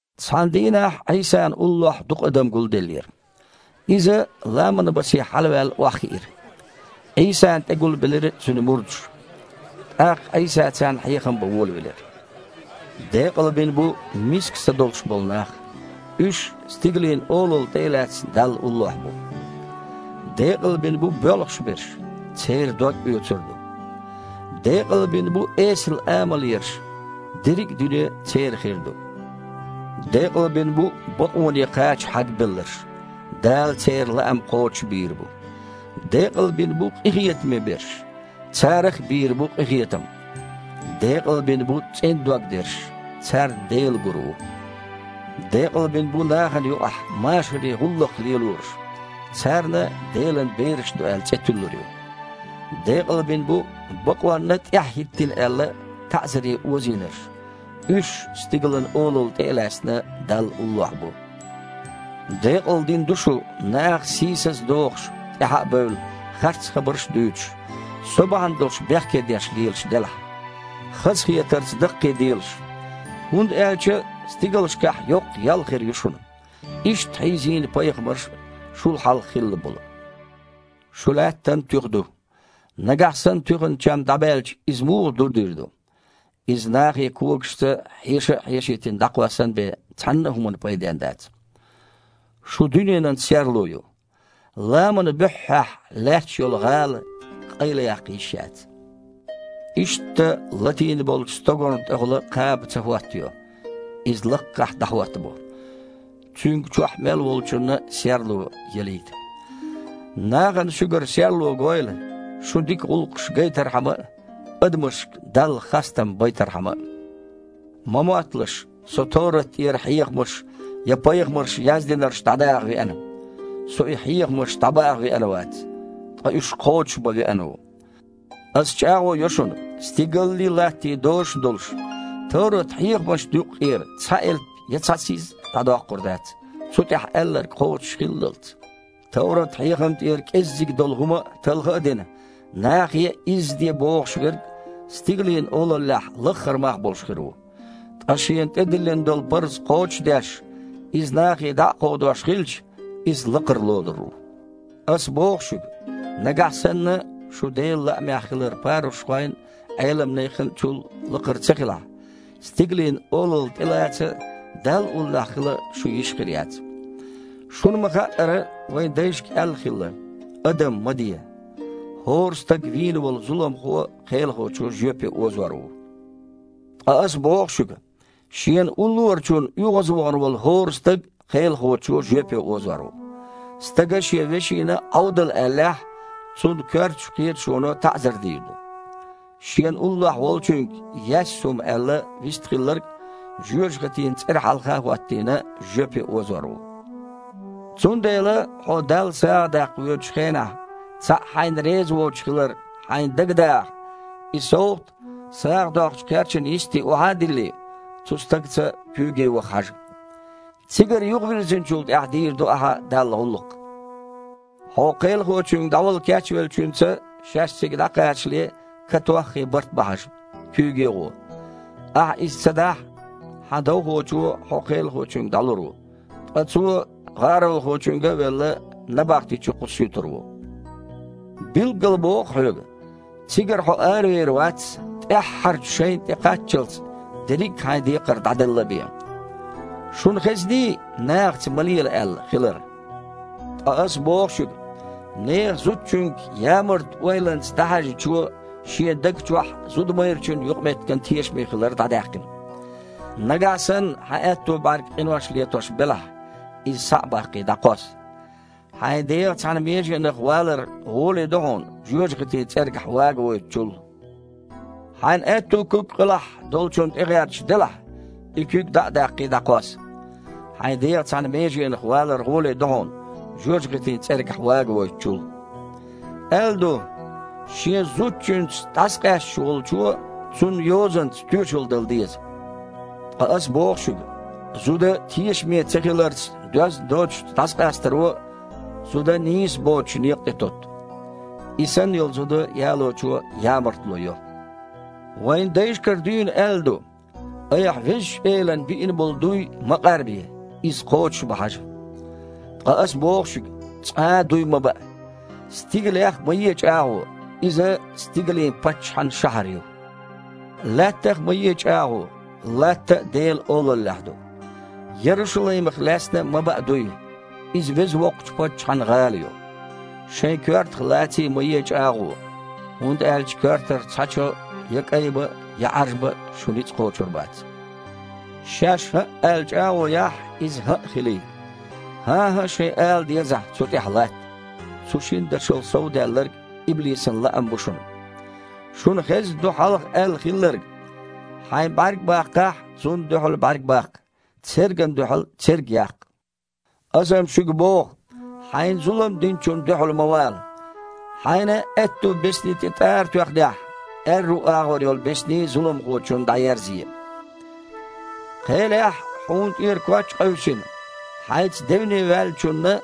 Цхьана дийнахь Іийсана уллохь дукха адам гулделлера. Иза, ламанан басе хьалаваьлла, охьахиира. Іийсана тІе гулбелира Цуьнан мурдаш. ТІаккха Іийса царна хьехам бан волавелира: «Декъалбина бу миска са долуш болу нах – уьш, Стигалийн Олалла тІе а лаьцна, Далла уллохь бу. Декъалбина бу боьлхуш берш – церан дог оьцур ду. Декъалбина бу эсала амал ерш – дерриг а дуьне церан хир ду. Декъалбина бу бакъоне кхача хьагбелларш – Дала церан лаам кхочушбийр бу. Декъалбина бу къинхетаме берш – царах а бийр бу къинхетам. Декъалбина бу цІена дог дерш – царна Дела гур ву. Декъалбина бу нахана юкъахь машаре гІуллакх лелорш – царна, Делан бераш ду аьлла, цІе туьллур ю. Декъалбина бу, бакъонна тІаьхьахІиттина аьлла, таІзаре озийнарш – уьш, Стигалийн Олалла тІе а лаьцна, Далла уллохь бу». «Декъалдина ду шу, наха сийсаза дохуш, тІаьхьа а бевлла, харц хабарш а дуьйцуш, Со бахьана долуш бехкедеш лелаш делахь. Хазахетарца даккхийделаш! ХІунда аьлча стигалшкахь йоккха ял хир ю шуна. Иштта хьийзийна пайхамарш а, шул хьалха хилла болу». «Шу Лаьттан туьха ду. Нагахь санна туьхан чам дІабаьлча, иза муха дурдийр ду? Иза, нахе когашца хьеша а хьешийтина, дІакхоссан бен, цхьанна а хІуманна пайденна дац. Шу дуьненан серло ю. Ламанан буьххьехь лаьтташ йолу гІала къайлаяккха йиш яц. Иштта латийна йолчу стогарна тІехула кхаба ца хІоттайо – иза лаккхахь дІахІоттабо, цуьнга чохь мел волчунна а серло ялийта. Нахана шуьгара серло гойла, шун дика гІуллакхаш гайтархьама а, адамашка Далла хастам байтархьама а». «Ма мотталаш, Со товрат тІера хьехамаш я пайхамарша яздинарш дІадаха веана. Со и хьехамаш дІабаха веана вац, ткъа уьш кхочушбан веана ву. Аса чІагІо йо шуна: стигаллий, латтий дозуш а долуш, товрат-хьехамашна юккъера цхьа элп я цхьа сиз а дІадоккхур дац, цу тІехь аьлларг кхочушхиллалц. Товрат-хьехам тІера кІеззиг долу хІума а талха а дина, нахе а изза де бохуш верг Стигалийн Олаллехь лаххара мах болуш хир ву. Ткъа шена тІедиллина долу парз кхочуш а деш, иза нахе дІа а кховдош хилча, иза лакхара лорур ву. Аса боху шуьга: нагахь санна шун Делан лаамехь хилар парушхойн а, Іелам нехан а чул лакхара ца хилахь, Стигалийн Олалла тІелаца а, Далла уллохь хила а шун йиш хир яц». «Шуна ма-хаъара, вайн дайшка аьлла хилла: „Адам ма де. ХІора стаг вийна волу зуламхо кхелахочо жоьпе озор ву“. Ткъа Аса боху шуьга: шена уллорачунна оьгІазвахана волу хІора стаг кхелахочо жоьпе озор ву. Стага шен вешина а „Іовдал!“ аьллехь, цунна коьртачу кхеташоно таІзар дийр ду. Шена уллохь волчуьнга: „Яьсса хІума!“ – аьлла, вистхилларг, жоьжахатин цІера хьалха а хІоттийна, жоьпе озор ву. Цундела хьуо Далла сагІа даккха воьдучу хенахь цхьаъ хьайна реза воцуш хилар хьайна дага дагІахь, и совгІат сагІа доккхучу кхерчана йисте охьа а диллий, цу стагаца куьйге ваха хьажа. Цигара юхавирзинчул тІаьхьа дийр ду ахьа Далла гІуллакх. Хьо кхелахочуьнга дІавала кечвеллачуьнца, шаьш цига дІакхачале, катоххий барт бан хьажа, куьйге а гІо. Ахьа иза ца дахь, хьан довхочо хьо кхелахочуьнга дІалур ву, ткъа цо гІаролхочуьнга а велла, набахти чу кхуссуьйтур ву. Билггала боху хьоьга: цигара хьо аравер вац, тІаьххьарчу шайнна тІекхаччалц, дерриг а хьайн декхар дІаделла а бен». «Шуна хезний: „Нахаца ма лела“, – аьлла хилар? Ткъа Аса боху шуьга: нехан зудчуьнга ямарта ойланца дІахьаьжначо шен даг чохь зуда-майрачун юкъаметтиган тешаме хилар дІадаьккхина. Нагахь санна хьан аьтту бІаьрг къинош летош белахь, иза схьа а баккхий, дІакхосса. Хьайн дегІан цхьана меженах влар гІоле ду хьуна, жоьжахатин цІергахь вагавойтучул. Хьайн аьтту куьг къилахь долчунна тІегІерташ делахь, и куьг дІа а даккхий, дІакхосса. Хьайн дегІан цхьана меженах влар гІоле ду хьуна, жоьжахатин цІергахь вагавойтучул». «Аьлла ду: „Шен зудчуьнца дІасакъаьсташ волчо цунна йозанца тоьшалла дала деза“. Ткъа Аса боху шуьга: зуда тешаме ца хиларца доьзна доцучу дІасакъастаро, зуда нийса боцучу некъа тІе тоьтту. И санна йолу зуда ялочо ямартло йо». «Вайн дайшкара дуьйна аьлла ду: „Айхьа Везачу Элана биина болу дуй ма къарбе, иза кхочушбан хьажа“. Ткъа Аса боху шуьга: цкъа а дуй ма баа. Стигалех а ма е чІагІо – иза стигалийн Паччахьан шахьар ю. Лаьттах а ма е чІагІо – Латта а Делан Олаллехь ду. Ярушалаймах лаьцна а ма баа дуй – иза веза воккхачу Паччахьан гІала ю. Шайн коьртах лаций а ма е чІагІо, хІунда аьлча коьртара цхьа чо я кІайбан а, я Іаржбан а шун ницкъ кхочур бац. Шаьш, „хІаъ“ аьлла, чІагІо яхь, иза „хІаъ“ хилийта. „ХІан-хІа“ шайн ала дезахь, цу тІехь латта. Цу шина дашал сов даьлларг – иблисан лаам бу шуна». «Шуна хезна ду хьалха аьлла хилларг: „Хьайн бІаьрг баккхахь, – цунна дуьхьал бІаьрг баккха, цергана дуьхьал церг яккха“. Аса-м шуьга боху: хьайна зулам динчунна дуьхьал ма вала. Хьайна аьтту бесни тІе тІара тоьхнехь, аьрру агІор йолу бесни а зуламхочунна тІеерзае. Кхелехь хьуна тІера коч а къевсина, хьайца девне ваьллачунна,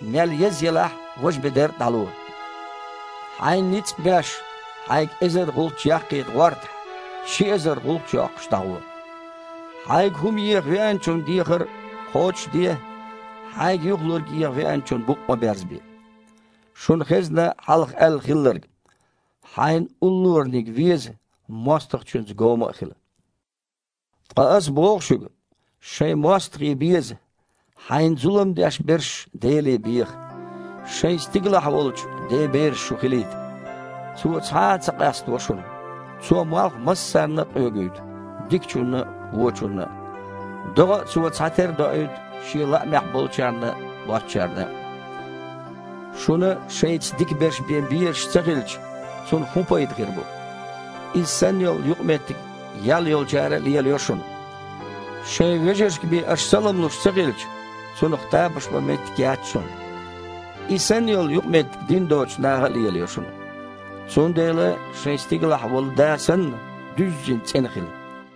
мел еза елахь а, важа бедар а дІало. Хьайна ницкъ а беш, хьайга эзар гІулч яккхийта гІортахь, ши эзар гІулч а йоккхуш, дІагІо. Хьайга хІума йиэха веанчун дехар кхочуш а де, хьайга юхалург еха веанчунна букъ а ма берзабе». «Шуна хезна хьалха аьлла хилларг: „Хьайн уллораниг веза, мостагІчуьнца гома а хила“. Ткъа Аса боху шуьга: шайн мостагІий беза, хьайна зулам деш берш Деле беха – шайн стигалахь волчу Ден бераш шу хилийта. Цо цхьа а ца къаставо шуна: Цо малх массарна а къоьгуьйту – дикачунна а, вочунна а. ДогІа а Цо цхьатерра доуьйту Шен лаамехь болчарна а, боцучарна а. Шуна шайца дика берш бен безаш ца хилча, цунах хІун пайда хир бу? Иза санна йолу юкъаметтиг-м ял йоккхучара а лелайо шуна. Шайн вежаршка бен аша салам луш ца хилча, цунах тамаш бан меттиг яц шуна. И санна йолу юкъаметтиг дин доцучу наха а лелайо шуна. Цундела, шайн стигалахь волу Да санна, дуьззина цІена хила».